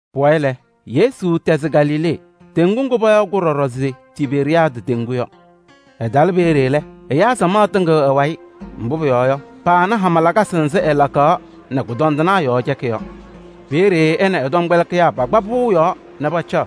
Pʋwayɩ lɛ, Yesu tɛzɩ Galilee teŋgu ŋgʋ payaɣ ɖɔɖɔ se Tiberiyaadɩ teŋgu yɔ kʋ-wayɩ. Ɛtalɩ peeye lɛ, ɛyaa samaɣ tɩŋɩɣ ɛ-wayɩ, mbʋ pʋyɔɔ yɔ, paana hama lakasɩ nzɩ ɛlakaɣ nɛ kʋdɔndɩnaa yɔɔ cɛkɩ yɔ. Peeye ɛ nɛ ɛ-tɔmkpɛlɩkɩyaa pakpa pʋʋ yɔɔ nɛ pacaɣ.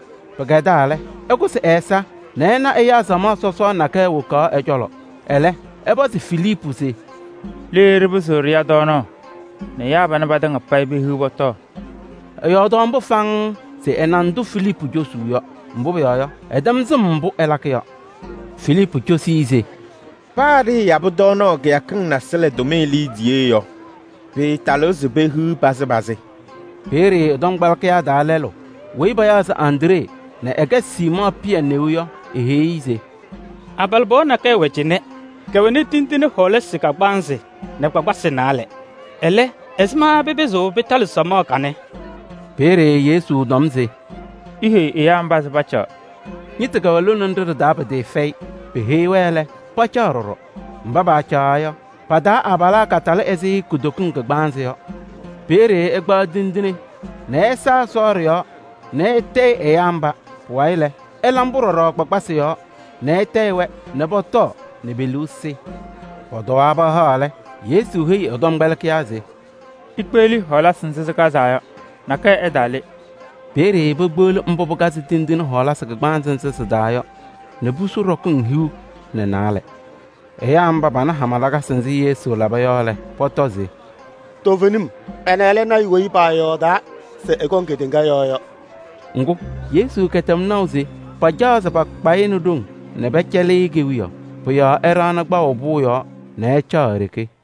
Pɩkɛdaa lɛ, ɛkʋsɩ ɛ-ɛza nɛ ɛna ɛyaa samaɣ sɔsɔɔ nakɛyɛ wokaɣ ɛ-cɔlɔ. Ɛlɛ ɛpɔzɩ Filiipu se: “Le ɖɩpɩzɩɣ ɖɩya tɔɔnaɣ nɛ ɛyaa panɛ patɩŋa payɩ pehiɣ pɔtɔɔ?” Ɛyɔɔdaɣ mbʋ faŋŋ se ɛna ndʋ Filiipu cosuu yɔ, mbʋ pʋyɔɔ yɔ, ɛtɛm sɩm mbʋ ɛlakɩ yɔ. Filiipu cosi-i se: “Paa ɖɩɩyabɩ tɔɔnaɣ kɩyakɩŋ nasɩlɛ tʋmɩyɛ liidiye yɔ, pɩɩtalɩɣ se pehiɣ pazɩ pazɩ.” Peeye ɛ-tɔmkpɛlɩkɩyaa taa lɛlʋ weyi payaɣ se Andree nɛ ɛkɛ Siimɔɔ Pɩyɛ neu yɔ, eheyi-i se: “Abalɩbɩɣa nakɛyɛ wɛ cɩnɛ, kɛwɛnɩ tindine kagbaanzɩ nɛ kpakpasɩ naalɛ. Ɛlɛ, ɛzɩma pɩpɩzɩɣ pɩtalɩ samaɣ kanɛ?” Peeye Yesu tɔm se: “Iheyi ɛyaa mba se pacaɣ.” Ñɩtʋ kɛwɛ lone nɖɩ ɖɩ-taa pɩtɩɩfɛyɩ. Peheyi-wɛ lɛ, pacaɣ ɖɔɖɔ. Mba paacaɣaɣ yɔ, pa-taa abalaa katalɩ ɛzɩ kutokiŋ kagbaanzɩ yɔ. Peeye ɛkpaɣ tindine nɛ ɛsa Ɛsɔ ɖɩ-yɔɔ nɛ ɛtayɩ-ɖɩ ɛyaa mba. Pʋwayɩ lɛ, ɛla mbʋ ɖɔɖɔ kpakpasɩ yɔɔ nɛ ɛtayɩ-wɛ nɛ pɔtɔɔ nɛ pe-liu sɩ. Pɔtɔwaa pahaɣ lɛ, Yesu heyi ɛ-tɔmkpɛlɩkɩyaa se: “Ikpeɣli hɔɔlasɩ nzɩ sɩkazaa yɔ, nakɛyɛ ɛtaale.” Peeye pekpeɣli tindine kagbaanzɩ ana a-hɔɔlasɩ nzɩ sɩkazaa yɔ nɛ pusu ɖɔkɩŋ hiu nɛ naalɛ. Ɛyaa mba, pana hama lakasɩ nzɩ Yesu laba yɔ lɛ, pɔtɔ se: “Toovenim, ɛnɛ lɛ lɔɔyaɣ tʋ weyi paayɔɔdaa se ɛkɔŋ kedeŋa yɔɔ yɔ.” Ŋgʋ, Yesu kɛtɛm naʋ se pacaɣ pakpa-ɩ nɛ ɖoŋ nɛ pɛcɛlɩ-ɩ kewiyaɣ. Pʋ-yɔɔ ɛɖaɣnɩ kpaʋ pʋʋ yɔɔ nɛ ɛcaɣ e-ɖeke.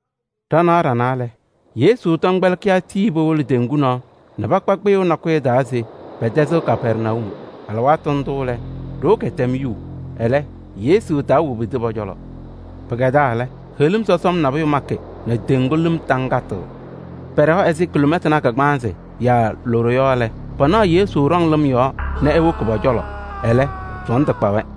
Ɖanaɣ ɖanaa lɛ, Yesu tɔmkpɛlɩkɩyaa tii powolo teŋgu nɔɔ nɛ pakpa kpɩyʋʋ nakʋyʋ taa se pɛtɛzɩɣ Kapɛrnayum. Alɩwaatʋ ndʋ lɛ, ɖoo kɛtɛm yuu, ɛlɛ, Yesu taawobidi pɔ-cɔlɔ. Pɩkɛdaa lɛ, heɣlim sɔsɔm nabʋyʋ makɩ nɛ teŋgu lɩm taŋtɩɣ. Pɛɖɛwa ɛzɩ kiloomɛtanaa kagbaanzɩ yaa loɖo yɔ lɛ, panaɣ Yesu ɖɔŋ lɩm yɔɔ nɛ ewoki pɔ-cɔlɔ, ɛlɛ sɔɔndʋ kpa-wɛ.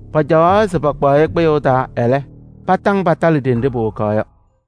Pacaɣaɣ se pakpaɣ-ɩ kpɩyʋʋ taa, ɛlɛ, patɩŋ patalɩ ɖenɖe powokaɣ yɔ.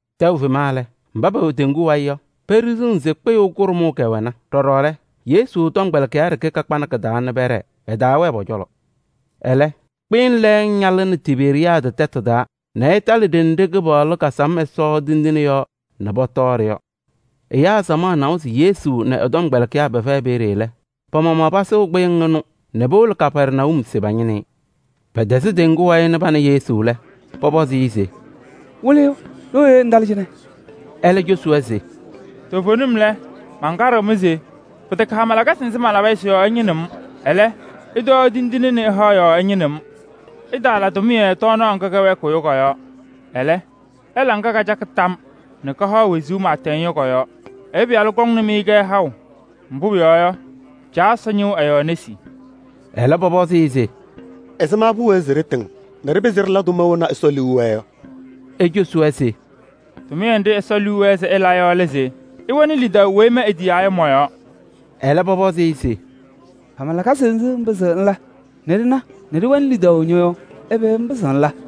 Tɛʋ fema lɛ, mba pɛwɛ teŋgu wayɩ yɔ, peɖiɣzina se kpɩyʋʋ kʋɖʋmʋʋ kɛwɛna. Ɖɔɖɔ lɛ, Yesu tɔmkpɛlɩkɩyaa ɖeke kakpanɩ kɩ-taa nɛ pɛɖɛɛ, ɛtaawɛɛ pɔ-cɔlɔ. Ɛlɛ, kpɩyɩŋ lɛɛŋ ñaalɩnɩ Tiberiyaadɩ tɛtʋ taa nɛ ɩtalɩ ɖenɖe Kɩpaɣlʋ kasam Ɛsɔ tindine yɔɔ nɛ pɔtɔɔ-ɖɩ yɔ. Ɛyaa samaɣ nawa se Yesu nɛ ɛ-tɔmkpɛlɩkɩyaa pɛfɛyɩ peeye lɛ, pa-maɣmaɣ pasʋʋ kpɩyɩŋ ɩnʋ nɛ powolo Kapɛrnayum se pañɩnɩ-ɩ. Pɛtɛzɩ teŋgu wayɩ nɛ pana Yesu lɛ, pɔpɔzɩ-ɩ se: “Wɩlɩyʋ! Ɖooye ŋtalɩ cɩnɛ?” Ɛlɛ cosi-wɛ se: “Toovenim lɛ, mankaɖɩɣ-mɩ se pɩtɛkɛ hama lakasɩ nzɩ malaba nɛ ɩna yɔ, sɩ-yɔɔ ɩñɩnɩɣ-m. Ɛlɛ, ɩtɔɔ tindine nɛ ɩhaɣ yɔɔ ɩñɩnɩɣ-m. Ɩtaala tʋmɩyɛ tɔɔnaɣ ŋga kɛwɛɛkɩɣ yɔ kɔ-yɔɔ. Ɛlɛ, ɩla ŋga kacakɩ tam nɛ kahaɣ wezuu pɩɩtɛŋ yɔ kɔ-yɔɔ. Ɛyʋ Pɩyalʋ kɔŋnɩ-mɩ-kɛ haʋ, mbʋ pʋyɔɔ yɔ, Caa Ɛsɔ ñɩɣ ɛ-yɔɔ nesi.” Ɛlɛ, pɔpɔzɩ-ɩ se: “Ɛzɩma pʋwɛɛ se ɖɩtɩŋ nɛ ɖɩpɩzɩ ɖɩla tʋma wena Ɛsɔ liu wɛɛ yɔ?” Ecosi-wɛ se: “Tʋmɩyɛ nɖɩ Ɛsɔ liu wɛɛ se ɩla yɔ lɛ se ɩwɛnɩ lidaʋ weyi ma etiyaa yɔ mɔ-yɔɔ.” Ɛlɛ pɔpɔzɩ-ɩ se: “Hama lakasɩ nzɩ ŋpɩzɩɣ ŋla nɛ ɖɩna nɛ ɖɩwɛnɩ lidaʋ ñɔ-yɔɔ? Ɛbɛ ŋpɩzɩɣ ŋla?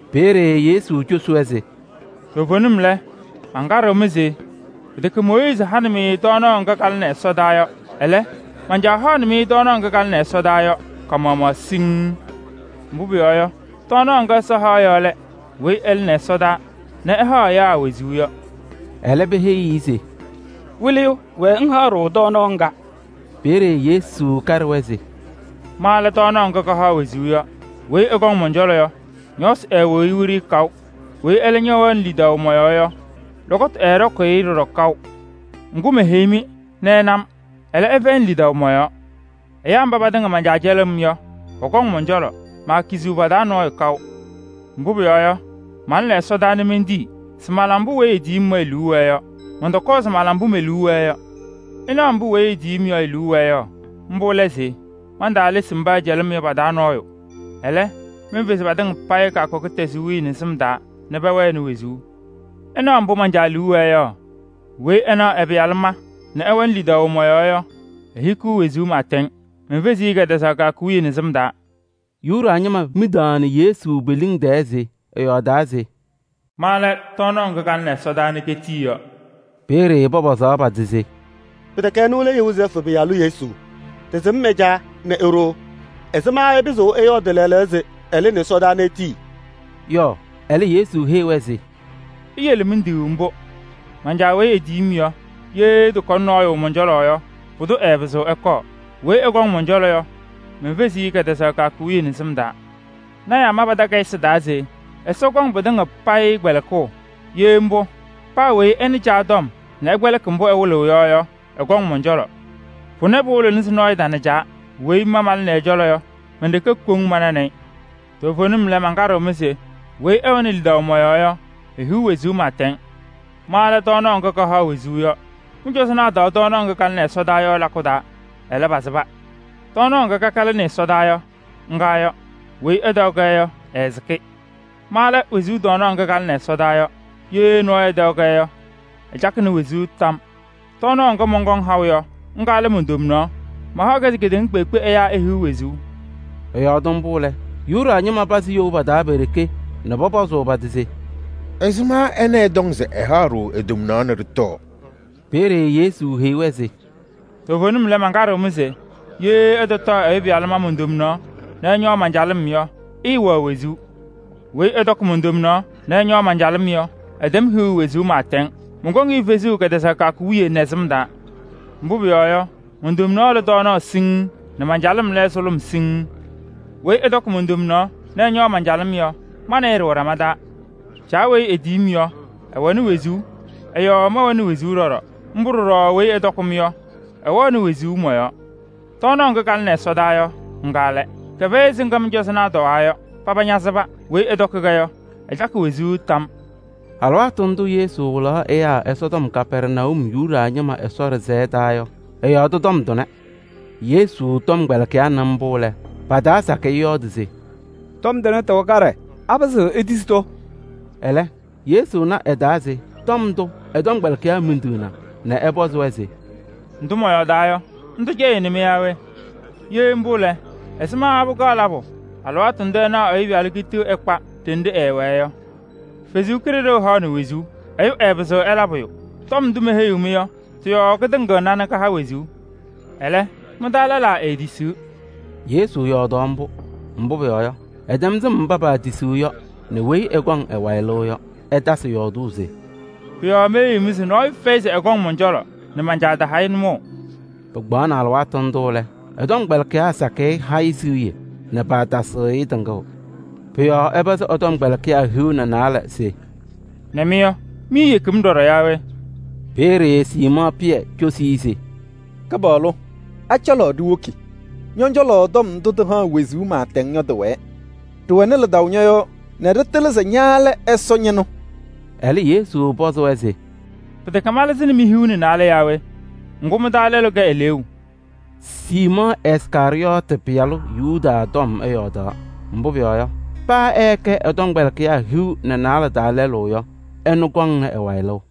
Peeye Yesu cosi-wɛ se: “Toovenim lɛ, mankaɖɩɣ-mɩ se pɩtɛkɛ Mooyiizi hanɩ-mɩ tɔɔnaɣ ŋga kalɩnɩ ɛsɔdaa yɔ. Ɛlɛ, man-Caa haɣnɩ-mɩ tɔɔnaɣ ŋga kalɩnɩ ɛsɔdaa yɔ ka-maɣmaɣ siŋŋ. Mbʋ pʋyɔɔ yɔ, tɔɔnaɣ ŋga Ɛsɔ haɣ yɔ lɛ ɛyʋ weyi ɛlɩnɩ ɛsɔdaa nɛ ɛhaɣ ɛyaa wezuu yɔ.” Ɛlɛ peheyi-i se: “Wɩlɩyʋ! Wɛɛ ŋhaɣ-ɖʋ tɔɔnaɣ ŋga.” Peeye Yesu kaɖɩ-wɛ se: “Ma lɛ tɔɔnaɣ ŋga kahaɣ wezuu yɔ. Weyi ɛkɔŋ mɔn-cɔlɔ yɔ, ñɔɔsɩ ɛɛwɩɣ-ɩ wiɖiyi kaʋ, weyi ɛlɛ wɛɣnɩ lidaʋ mɔ-yɔɔ yɔ, lɔkɔtʋ ɛɛɖɔkʋʋ-ɩ ɖɔɖɔ kaʋ. Ŋgʋ, meheyi-mɩ nɛ ɩna-m, ɛlɛ, ɩfɛyɩnɩ lidaʋ mɔ-yɔɔ. Ɛyaa mba patɩŋa man-Caa cɛlɩɣ-m yɔ, pɔkɔŋ mɔn-cɔlɔ, maakiziɣ pa-taa nɔɔyʋ kaʋ. Mbʋ pʋyɔɔ yɔ, malɩnɩ ɛsɔdaa mentii se mala mbʋ weyi etiyi-m yɔ e-liu wɛɛ yɔ. Mɔntɔkɔɔ se mala mbʋ me-liu wɛɛ yɔ. Ɩɩnaɣ mbʋ weyi etiyi-m yɔ e-liu wɛɛ yɔ. Mbʋ lɛ se: mantaalesi mba ɛcɛlɩ-m yɔ pa-taa nɔɔyʋ. Ɛlɛ, menfezi patɩŋa payɩ kɛtɛzaɣ kɩyakʋ wiye nɛ sɩm taa nɛ pɛwɛɛ wezuu. Ɩɩnaɣ mbʋ man-Caa liu wɛɛ yɔ: weyi ɛnaɣ ɛ-Pɩyalʋ ma nɛ ɛwɛnɩ lidaʋ mɔ-yɔɔ yɔ, ehikiɣ wezuu pɩɩtɛŋ. Menfeziɣ-i kɛtɛzaɣ kɩyakʋ wiye nɛ sɩm taa.” Yuda ñɩma midaɣnɩ Yesu pe-liŋ tɛɛ se ɛyɔɔdaa se: “Ma lɛ tɔɔnaɣ ŋga kalɩnɩ ɛsɔdaa nɛ ketii yɔ.” Peeye pɔpɔzaɣ pa-tɩ se: “Pɩtɛkɛ ɛnʋ lɛ Yozɛɛfʋ pɩyalʋ Yesu? Ɖɩsɩm ɛ-caa nɛ e-ɖoo, ɛzɩma ɛpɩzɩɣ ɛyɔɔdɩ lɛɛlɛɛyɔ se ɛlɩnɩ ɛsɔdaa nɛ etii” yɔ? Ɛlɛ Yesu heyi-wɛ se: “Iyele miduu mbʋ. Man-Caa weyi etiyi-m yɔ, ye ɛtɔkɔnɩ nɔɔyʋ mɔn-cɔlɔ yɔ, pʋdʋ ɛɛpɩzɩɣ ɛkɔɔ. Weyi ɛkɔŋ mɔn-cɔlɔ yɔ, menfeziɣ-i kɛtɛzaɣ kɩyakʋ wiye nɛ sɩm taa. Lɔɔyɩsɩ tɩnaa ma pa-takayɩsɩ taa se: ‘Ɛsɔ kɔŋ patɩŋa payɩ kpɛlɩkʋʋ.’ Ye mbʋ, paa weyi ɛnɩ Caa tɔm nɛ ɛkpɛlɩkɩ mbʋ ɛwɩlɩ-ɩ yɔ yɔ, ɛkɔŋ mɔn-cɔlɔ. Pʋnɛ pɩɩwɩlɩɣ se nɔɔyʋ na Caa. Weyi ma malɩnɩ Ɛsɔ cɔlɔ yɔ, men-ɖeke koŋ mananɩ-ɩ. Toovenim lɛ, mankaɖɩɣ-mɩ se: weyi ɛwɛnɩ lidaʋ mɔ-yɔɔ yɔ, ehiɣ wezuu pɩɩtɛŋ. Ma lɛ tɔɔnaɣ ŋga kahaɣ wezuu yɔ. Mɩ-cɔzɔnaa tɔɔ tɔɔnaɣ ŋga kalɩnɩ ɛsɔdaa yɔ lakʋ taa, ɛlɛ, pasɩba. Tɔɔnaɣ ŋga kaka lɩnɩ ɛsɔdaa yɔ, ŋga yɔ. Weyi ɛtɔɔ-kɛ yɔ, ɛɛsɩkɩ. Ma lɛ wezuu tɔɔnaɣ ŋga kalɩnɩ ɛsɔdaa yɔ. Ye nɔɔyʋ ɛtɔɔ-kɛ yɔ, ɛcakɩ wezuu tam yɔɔ. Tɔɔnaɣ ŋga mɔnkɔŋ haʋ yɔ, ŋga lɛ mon-tomnaɣ. Mahaɣ-kɛ se kedeŋa kpeekpe ɛyaa ehiɣ wezuu.” Ɛyɔɔdɩ mbʋ lɛ, Yuda ñɩma pazɩ you pa-taa pe-ɖeke nɛ pɔpɔzʋʋ pa-tɩ se: “Ɛzɩma ɛnɛ ɛtɔŋ se ɛhaɣ-ɖʋ e-tomnaɣ nɛ ɖɩtɔɔ?” Peeye Yesu heyi-wɛ se: “Toovenim lɛ, mankaɖɩɣ-mɩ se: ye ɩtɔtɔɔ Ɛyʋ Pɩyalʋ ma mon-tomnaɣ nɛ ɩñɔɔ man-calɩm yɔ, ɩɩwɛɣ wezuu. Weyi ɛtɔkɩ mon-tomnaɣ nɛ ɛñɔɔ man-calɩm yɔ, ɛtɛm hiɣu wezuu pɩɩtɛŋ. Mɔnkɔŋ-ɩ fezuu kɛtɛzaɣ kɩyakʋ wiye nɛ sɩm taa. Mbʋ pʋyɔɔ yɔ, mon-tomnaɣ lɛ tɔɔnaɣ siŋŋ nɛ man-calɩm lɛ sʋlʋm siŋŋ. Weyi ɛtɔkɩ mon-tomnaɣ nɛ ɛñɔɔ man-calɩm yɔ, ma nɛ ɩ ɖɩwɛ ɖama taa. Caa tiyini-m, ɛwɛ wezuu, ɛ-yɔɔ mɛwɛ wezuu ɖɔɖɔ. Mbʋ ɖɔɖɔ weyi ɛtɔkɩ-m yɔ, ɛwɛɣ wezuu mɔ-yɔɔ. Tɔɔnaɣ ŋga kalɩnɩ ɛsɔdaa yɔ, ŋga lɛ. Kɛfɛyɩ ɛzɩ ŋga mɩ-cɔzɔnaa tɔwaa yɔ: paba ñasɩba. Weyi ɛtɔkɩ-kɛ yɔ, ɛcakɩ wezuu tam yɔɔ.” Alɩwaatʋ ndʋ Yesu wɩlaɣ ɛyaa Ɛsɔtɔm Kapɛrnayum Yuda ñɩma Ɛsɔ ɖɩsɛyɛ taa yɔ, ɛyɔɔdɩ tɔm tʋnɛ. Yesu tɔmkpɛlɩkɩyaa nɩ mbʋ lɛ, pa-taa sakɩyɛ yɔɔdɩ se: “Tɔm tʋnɛ, tɩwɛ kaɖɛ. Apɩzɩɣ etisi-tʋ?” Ɛlɛ, Yesu na ɛ-taa se tɔm ndʋ ɛ-tɔmkpɛlɩkɩyaa midiɣna nɛ ɛpɔzɩ-wɛ se: “Ndʋ mɔyɔɔdaa yɔ, ndʋ cɛyɩɣnɩ-mɩ yaa we? Ye mbʋ lɛ, ɛzɩma pɩkaɣ labʋ alɩwaatʋ ndʋ ɩnaɣ Ɛyʋ Pɩyalʋ kitiɣ ɛkpa ɖenɖe ɛɛwɛɛ yɔ? Ɛsɔ Kalɩzaɣ haɣnɩ wezuu. Ɛyʋ ɛɛpɩzɩɣ ɛla pʋyʋ. Tɔm ndʋ meheyi-mɩ yɔ, tɩ-yɔɔ katɩŋɩɣna nɛ kahaɣ wezuu. Ɛlɛ, mɩ-taa lɛlaa eetisiɣ.” Yesu yɔɔdaɣ mbʋ, mbʋ pʋyɔɔ yɔ, ɛtɛm sɩm mba paatisiɣ yɔ nɛ weyi ɛkɔŋ ɛ-wayɩ lɩʋ yɔ. Ɛtasɩ yɔɔdʋʋ se: “Pʋ-yɔɔ meheyi-mɩ se nɔɔyʋ fɛyɩ se ɛkɔŋ mɔn-cɔlɔ nɛ man-Caa taha-ɩ nʋmɔʋ.” Pɩkpaɣnɩ alɩwaatʋ ndʋ lɛ, ɛ-tɔmkpɛlɩkɩyaa sakɩyɛ ha-ɩ siɣye nɛ paatasɩɣ-ɩ tɩŋʋʋ. Pʋ-yɔɔ ɛpɔzɩ ɛ-tɔmkpɛlɩkɩyaa hiu nɛ naalɛ se: “Nɛ mɩ yɔ, miiyeki-m ɖɔɖɔ yaa we?” Peeye Siimɔɔ Pɩyɛ cosi-i se: “Kɩpaɣlʋ! A-cɔlɔ ɖiwoki? Ñɔ-cɔlɔ tɔm ndʋ tɩhaɣ wezuu pɩɩtɛŋ yɔ tɩwɛɛ. Ɖɩwɛnɩ lidaʋ ñɔ-yɔɔ nɛ ɖɩtɩlɩ se ña lɛ Ɛsɔ Ñɩnʋ.” Ɛlɛ Yesu pɔzɩ-wɛ se: “Pɩtɛkɛ malɩzɩnɩ mi-hiu nɛ naalɛ yaa we? Ŋgʋ, mɩ-taa lɛlʋ kɛ eleeu!” Siimɔɔ Iskarɩyɔɔtɩ pɩyalʋ Yudaasɩ tɔm ɛyɔɔdaɣ. Mbʋ pʋyɔɔ yɔ, paa ɛɛkɛ ɛ-tɔmkpɛlɩkɩyaa hiu nɛ naalɛ taa lɛlʋ yɔ, ɛnʋ kɔŋnɩ ɛ-wayɩ lɩʋ.